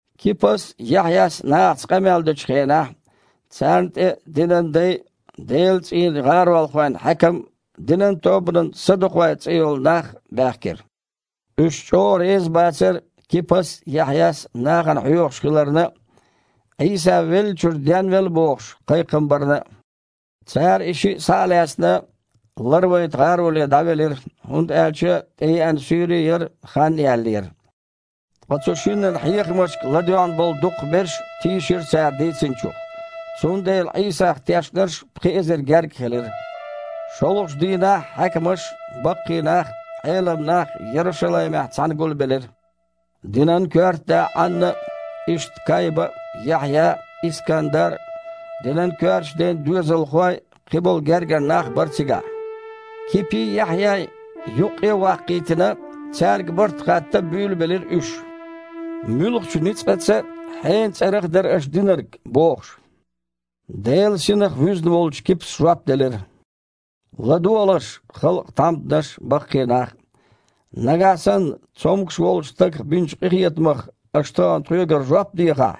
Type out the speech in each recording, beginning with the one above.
Кипас а, Яхьъяс а нахаца къамел дечу хенахь царна тІе динан дай а, Делан цІийнан гІаролхойн хьаькам а, динан тобанан садукъой цІе йолу нах а баьхкира. Уьш чІогІа реза бацара Кипас а, Яхьъяс а нахана хьоьхуш хиларна а, Іийса веллачуьра денвелла бохуш кхайкхам барна а. Цара и шиъ, схьа а лаьцна, ларвайта гІароле дІавелира, хІунда аьлча тІееана суьйре а яра, хан а яьллера. Ткъа цу шиннан хьехамашка ладоьгІна болу дукхахберш тийшира цара дийцинчух, цундела Іийсах тешнарш пхи эзар гергга хилира. ШолгІачу дийнахь хьаькамаш а, баккхий нах а, Іелам нах а Ярушалаймехь цхьаьна гулбелира. Динан коьрта да Іанна а, иштта Кайба а, Яхьъя а, Искандар а, динан коьртачу ден доьзалхой а, кхиболу гергара нах а бара цигахь. Кипий, Яхьъяй юккъе а ваккхийтина, цаьрга барт хатта буьйлабелира уьш: «Муьлхачу ницкъаца а, хьенан цІарах а дара аша динарг?» – бохуш. Делан Синах вуьзна волчу Кипас жоп делира: «ЛадогІалаш, халкъан тхьамданаш а, баккхий нах а! Нагахь санна цомгуш волчу стагах бинчу къинхетамах аша тахана тхоьгара жоп дехахь,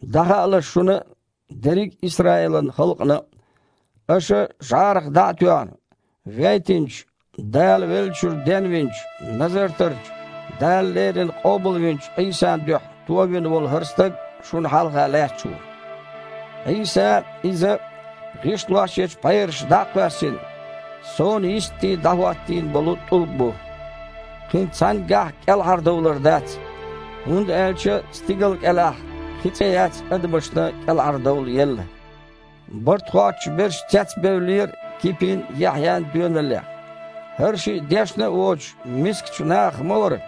дІахаалаш шуна а, дерриг Исраилан халкъана а: аша, жІарах дІа а тоьхна, вейтинчу, Дала веллачуьра денвинчу, Назартарчу, Дала леррина къобалвинчу Іийсан дуьхьа товина волу хІара стаг шуна хьалха лаьтташ ву! Іийса – Иза, „гІишлошъечу пхьераша дІа а кхоьссина, сонан йисте дІахІоьттина болу тІулг“ бу. Кхин цхьаьнггахь а кІелхьардовлар дац, хІунда аьлча стигал кІелахь кхин цІе яц адамашна кІелхьардовла елла». Барт хоттуш берш цецбевллера Кипин а, Яхьъян а доьналлех. ХІара шиъ дешна а воцуш, мискачу нахах ма вара.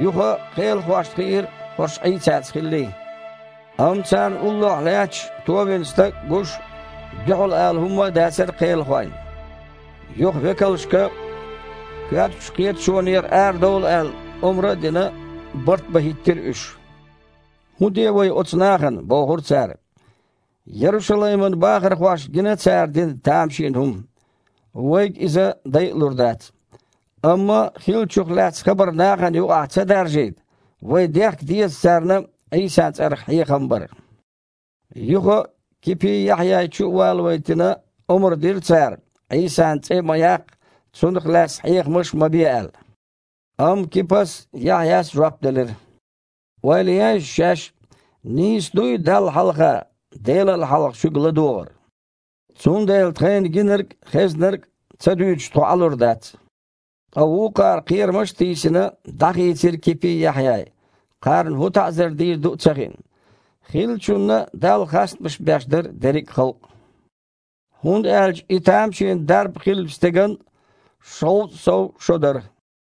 Юха кхелахошна хиира хІорш Іийсаца хиллий. Амма царна уллохь лаьтташ товина стаг а гуш, дуьхьал ала хІума дацара кхелахойн. Юха векалшка, коьртачу кхеташонера арадовла аьлла, омра а дина, барт бан хІиттира уьш. «ХІун де вай оцу нахана? – бохура цара. – Ярушалайман бахархошна гина цара дина тамашийна хІума. Вайга иза дайалур дац. Амма хиллачух лаьцна хабар нахана юкъахь ца даржийта, вай дехка деза царна Іийсан цІарах хьехам бар». Юха а Кипий, Яхьъяй чу а валавайтина, омра дира цара, Іийсан цІе а ма яккха, Цунах лаьцна хьехамаш а ма бе аьлла. Амма Кипас а, Яхьъяс а жоп делира: «Ойла ейша шаьш а, нийса дуй Далла хьалха, Делал хьалха шуьга ладогІар? Цундела тхайна гинарг а, хезнарг а ца дуьйцуш тхо Іалур дац». Ткъа вукхара, кхерамаш а тийсина, дІахийцира Кипий, Яхьъяй, кхарна хІун таІзар дийр ду а ца хиъна. Хиллачунна Далла хастамаш беш дара дерриг а халкъ. ХІунда аьлча и тамашийна дарба хиллачу стеган шовзткъа сов шо дара.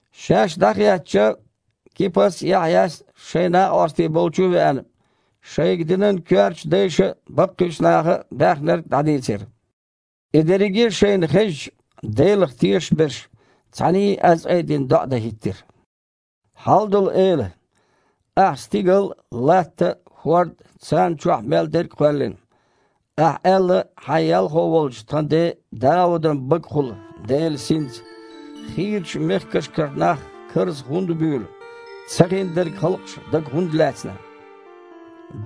Шаьш дІахецча, Кипас а, Яхьъяс а, шайн накъостий болчу а веана, шайга динан коьрта дайша а, баккхийчу наха а баьхнарг дІадийцира. И дерриге а шайна хезча, Делах тешаш берш цхьаьний аз айдина доІа дан хІиттира: «Хьалдолу Эла! Ахьа стигал а, латта а, хІорд а, царна чохь мел дерг а кхоьллина! Ахьа аьлла Хьайн ялхо волчу тхан ден а Даудан багахула Делан Синца: „Хийрачу мехкашкара нах карзах хІунда буьйлу? Цахиндерг халкъаша дага хІунда лаьцна?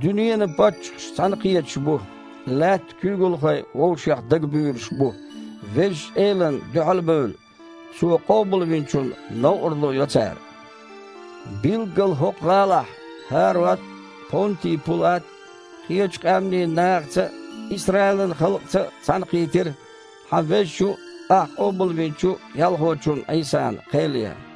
Дуьненан паччахьаш цхьаьнакхеташ бу, лаьттан куьйгалхой вовшех дагабуьйлуш бу, Везачу Элана дуьхьал а бевлла, Цо къобалвинчунна новкъарло йо цара“. Билггала, хІокху гІалахь ХІарод а, Понти Пулат а кхечу къаьмнийн нахаца а, Исраилан халкъаца а цхьаьнакхийтира Хьан Везачу а, Ахьа къобалвинчу а Ялхочунна Іийсана кхел ян.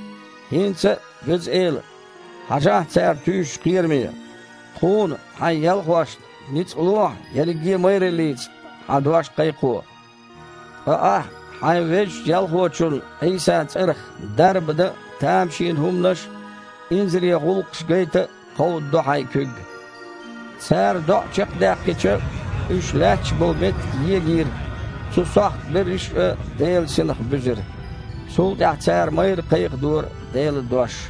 ХІинца а, Веза Эла, хьажахьа цара туьйсучу кхераме. Тхуна, Хьайн ялхошна, ницкъ лохьа ерриге а майраллица Хьан дош кхайкхо, ткъа Ахьа Хьайн Везачу Ялхочун Іийсан цІарах дарба дан а, тамашийна хІуманаш а, инзаре гІуллакхаш а гайта а кховдадо Хьайн куьг!» Цара доІа чекхдаьккхича, уьш лаьтташ болу меттиг егийра, цу сохьта берриш а Делан Синах буьзира. Цул тІаьхьа цара майрра кхайкхадора Делан дош.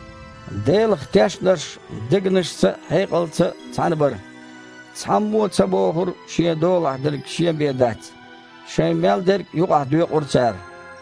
Делах тешнарш дегнашца а, хьекъалца а цхьаьна бара. Цхьаммо а ца бохура шен долахь дерг шен бен дац. Шайн мел дерг юкъахь доькъура цара.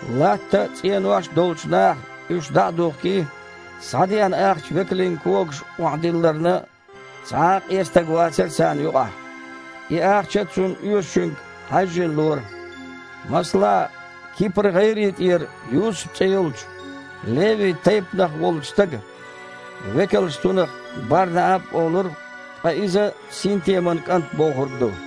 Латта а, цІенош а долчу наха, уьш дІа а духкий, схьадеана ахча векалийн когашка охьадилларна, цхьа а къен стаг вацара царна юкъахь. И ахча цунна оьшучуьнга хьаьжжина лора. Масала, Кипр-гІайре тІера Юсуп цІе йолчу, Леви тайпанах волчу стага (векалша цунах Бар-Нааб а олура, ткъа иза «синтеман кІант» бохург ду)